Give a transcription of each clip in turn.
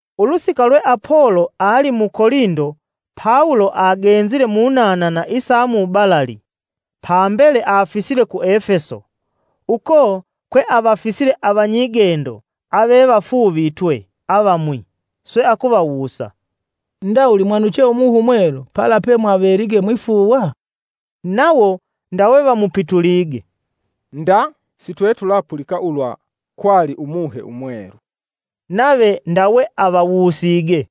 Ulusika lwe Apolo ali mu Kolindo Pawulo agenzile munanana isa mubalali, pambele afisile ku Efeso, uko kwe avafisile avanyigendo avevafuuvitwe avamwi. Swe akuvawusa, “Ndawuli mwamwanuche Umuhe Umwelu pala pemwavelige mwifuuwa?” Nawo ndawe vamupitulige, “Nda! Sitwetulapulika ulwa kwali Umuhe Umwelu.” Nave ndawe avawusige,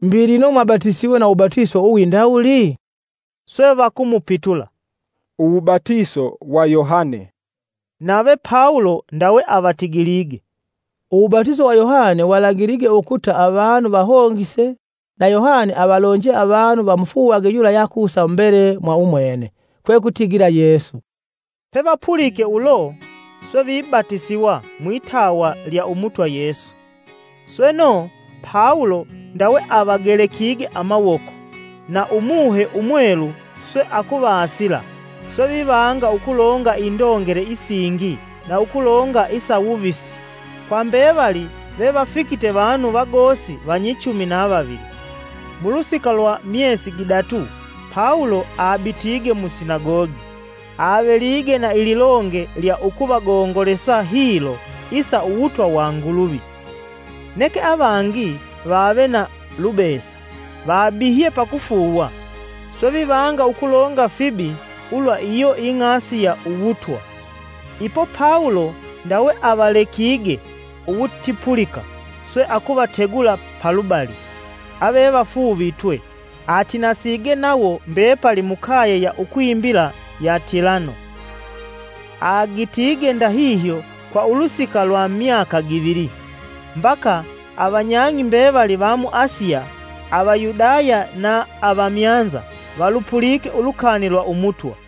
“Mbi lino mwabatisiwe na uwubatiso uwindawuli?” Swe vakumupitula, “Uwubatiso wa Yohane.” Nave Pawulo ndawe avatigilige, “Uwubatiso wa Yohane walagilige ukuta avanu vahongise na Yohane avalonje avanu vamufuuwage yula yeakusa mumbele mwa umwene, kwekutigila Yesu.” Pevapulike ulo, swe vibatisiwa mwitawa lya Umutwa Yesu. Sweno, Pawulo ndawe avagelekige amawoko, na Umuhe Umwelu swe akuvasila, swe vivanga ukulonga indongele isingi na ukulonga isa wuvisi. Kwa mbevali vevafikite vanu vagosi vanyichumi na vavili. Mulusika lwa myesi gidatu Pawulo abitige mu sinagogi, avelige na ililonge lya ukuvagongolesa hilo isa uwutwa wa Nguluvi. Neke avangi vave na lubesa, vabihye pakufuuwa, swe vivanga ukulonga fibi ulwa iyo ing'asi ya Uwutwa. Ipo Pawulo ndawe avalekige uwutipulika, swe akuvategula palubali avevafuuvitwe, atinasige nawo mbepali mukaye ya ukwimbila ya Tilano. Agitige ndahihyo kwa ulusika lwa myaka givili, mbaka avanyang'i mbevali va mu Asiya, Avayudaya na avamyanza, valupulike ulukani lwa Umutwa.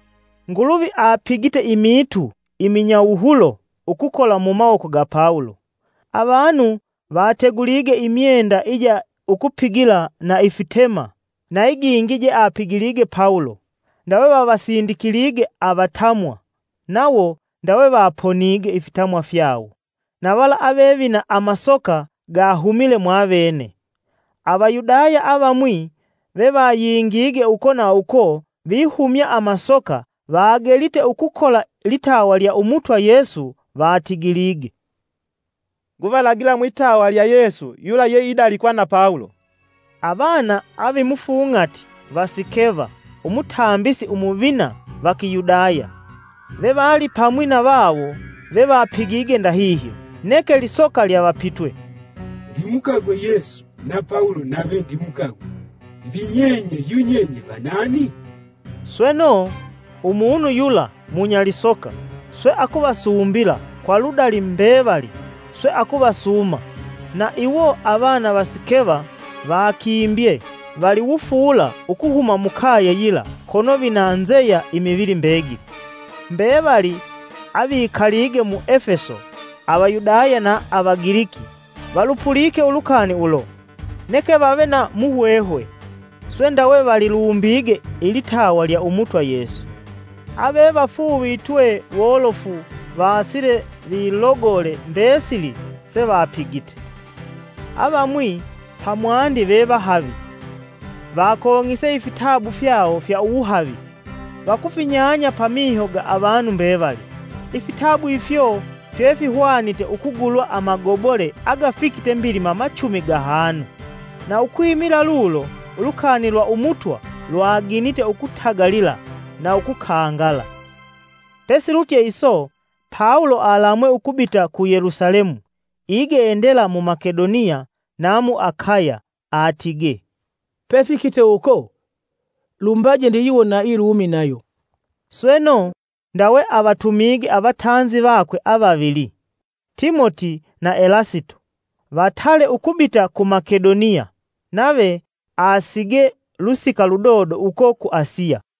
Nguluvi apigite imiitu iminyawuhulo ukukola mu mawoko ga Pawulo. Avanu vategulige imyenda ija ukupigila na ifitema na igingi jeapigilige Pawulo, ndawe vavasindikilige avatamwa, nawo ndawe vaponige ifitamwa fyawo; na vala ave vina amasoka gahumile mwavene. Avayudaya avamwi vevayingige uko na uko vihumya amasoka vagelite ukukola litawa lya Umutwa Yesu vatigilige, “Nguvalagila mwitawa lya Yesu yula ye idalikwa na Pawulo.” Avana avimufung'ati va Sikeva, Umutambisi Umuvina va Kiyudaya, vevalipamwi na vawo vevapigige ndahihyo. Neke lisoka lyavapitwe, “Ndimukagwe Yesu, na Pawulo nave ndimukagwe, mbi nyenye yunyenye vanani?” Sweno, umunu yula munya lisoka swe akuvasumbila kwa ludali mbevali, swe akuvasuuma. Na iwo avana va Sikeva vakimbye vali wufuula ukuhuma mukaye yila kono vina nzeya imivili mbegili. Mbevali avikalige mu Efeso Avayudaya na Avagiliki valupulike ulukani ulo, neke vave na muhwehwe, swe ndawe valilumbige ilitawa lya Umutwa Yesu. Avevafuuvitwe wolofu vasile vilogole mbesili sevapigite. Avamwi pamwandi ve vahavi, vakong'ise ifitabu fyawo fya uwuhavi, vakufinyanya pamiho ga avanu mbevali, ifitabu ifyo fye fihwanite ukugulwa amagobole agafikite mbilima machumi gahanu. Na ukwimila lulo, ulukani lwa Umutwa lwaginite ukutagalila na ukukangala. Pesilutye iso, Pawulo alamwe ukubita ku Yelusalemu igendela mu Makedoniya na mu Akaya. Atigee, “Pefikite uko, lumbaje ndiyiwone na i Lumi nayo.” Sweno, ndawe avatumige avatanzi vakwe avavili, Timoti na Elasito, vatale ukubita ku Makedoniya, nave asigee lusika ludodo uko ku Asiya.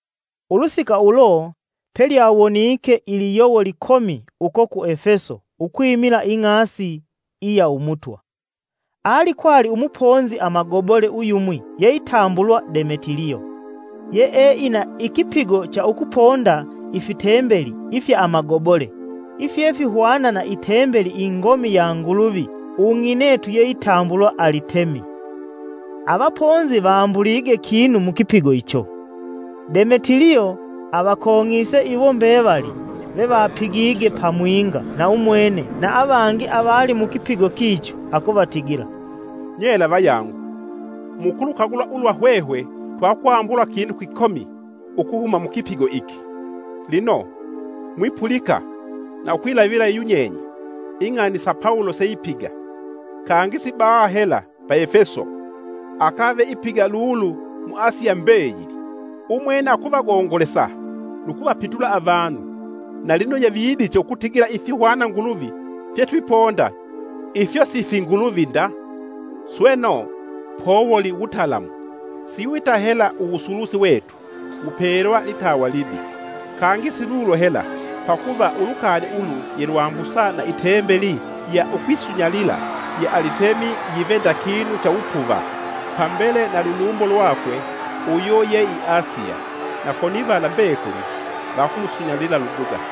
Ulusika ulo pelyawonike iliyowo likomi uko ku Efeso ukwimila Ing'asi iya Umutwa. Alikwali umuponzi amagobole uyumwi yeitambulwa Demetiliyo, yee ina ikipigo cha ukuponda ifitembeli ifya amagobole ifyefihwana na itembeli ingomi ya nguluvi ung'inetu yeitambulwa Alitemi. Avaponzi vambulige kinu mukipigo icho. Demetiliyo avakong'ise iwo mbevali vevapigige pamwinga na umwene na avangi avali mukipigo kicho, akuvatigila, “Nyela vayangu, mukulukagula ulwa hwehwe twakwambula kinu kikomi ukuhuma mukipigo iki. Lino, mwipulika na ukwilavila yunyenye ing'ani sa Pawulo seipiga, kangi si baha hela pa Efeso, akave ipiga lulu mu Asiya mbeyili. Umwene akuvagongolesa nu kuvapitula avanu na lino yevidiche ukutigila ifihwana nguluvi fyetwiponda ifyo si finguluvi nda. Sweno, powuli wutalamu siwita hela uwusulusi wetu wupelwa litawa libi. Kangi silulo hela, pakuva ulukani ulu yelwambusa na itembeli ya ukwisunyalila ya Alitemi yive nda kinu cha wupuva. Pambele na lulumbo lwakwe uyo ye i Asiya, na konivala mbekuli vakumusunyalila luduga.”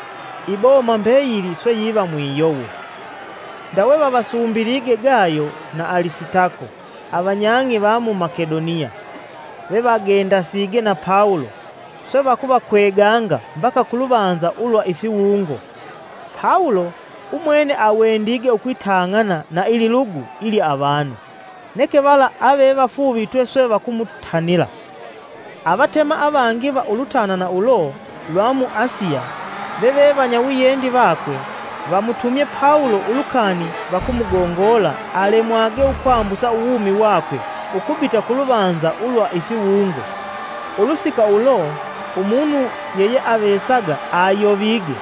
Iboma mbeyili swe yiva mwiyovo. Ndawe vavasumbilige Gayo na Alisitako, avanyang'i va mu Makedoniya, vevagendasige na Pawulo, swe vakuvakweganga mbaka ku luvanza ulwa ifiwungo. Pawulo umwene awendige ukwitang'ana na ililugu ilya avanu, neke vala ave vafuuvitwe swe vakumutanila. Avatema avangi va ulutanana ulo lwa mu Asiya, veve vanyawiyendi vakwe, vamutumye Pawulo ulukani vakumugongola alemwage ukwambusa uwumi wakwe ukubita ku luvanza ulwa ifiwungo. Ulusika ulo, umunu yeyeavesaga ayovige,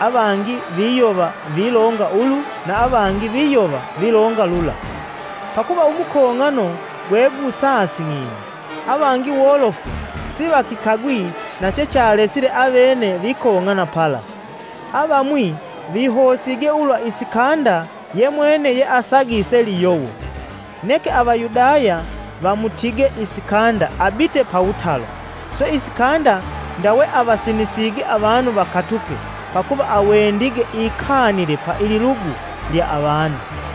avangi viyova vilonga ulu na avangi viyova vilonga lula, pakuva umukong'ano gwegusasing'ine. Avangi wolofu sivakikagwi na chechalesile avene vikong'ana pala. Avamwi vihosige ulwa Isikanda ye mwene yeasagise liyowo, neke Avayudaya vamutige Isikanda abite pawutalo, swe Isikanda ndawe avasinisige avanu vakatuke pakuva awendige ikanile pa ililugu lya avanu.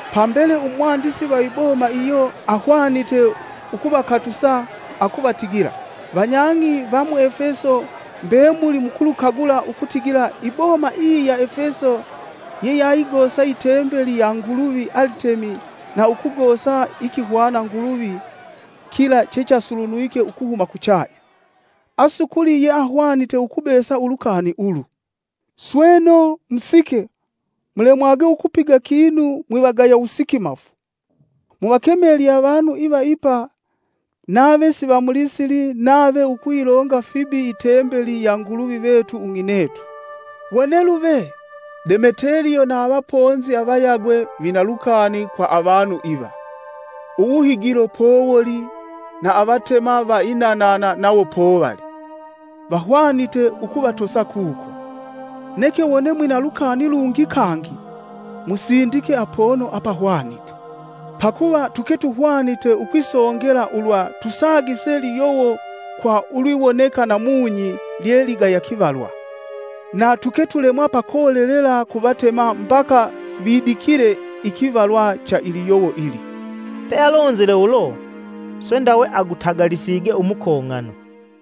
Pambele umwandisi va iboma iyo ahwanite ukuvakatusa akuvatigila, “Vanyang'i va mu Efeso, mbemuli mukulukagula ukutigila iboma iyi ya Efeso ye yayigosa itembeli ya nguluvi Alitemi na ukugosa ikihwana nguluvi kila chechasulunwike ukuhuma kuchanya. Asukuli yeahwanite ukubesa ulukani ulu. sweno, musike, mulemwage ukupiga kinu mwivagaya wusikimafu. Muvakemelye avanu iva ipa nave sivamulisili nave ukuyilonga fibi itembeli ya nguluvi vetu ung'inetu. Wone luve, Demeteliyo na avaponzi avayagwe vina lukani kwa avanu iva, uwuhigilo powoli na avatema va inanana nawo povali, vahwanite ukuvatosa kuko. Neke wone mwina lukani lungi kangi, musindike apono apahwanite. Pakuva tuke tuhwanite ukwisongela ulwa tusagise liyowo kwa ulwiwoneka namunyi lye ligaya kivalwa. Na tuke tulemwa pakolelela kuvatema mbaka vidikile ikivalwa cha iliyowo ili.” Pealonzile ulo, swe ndawe agutagalisige umukong'ano.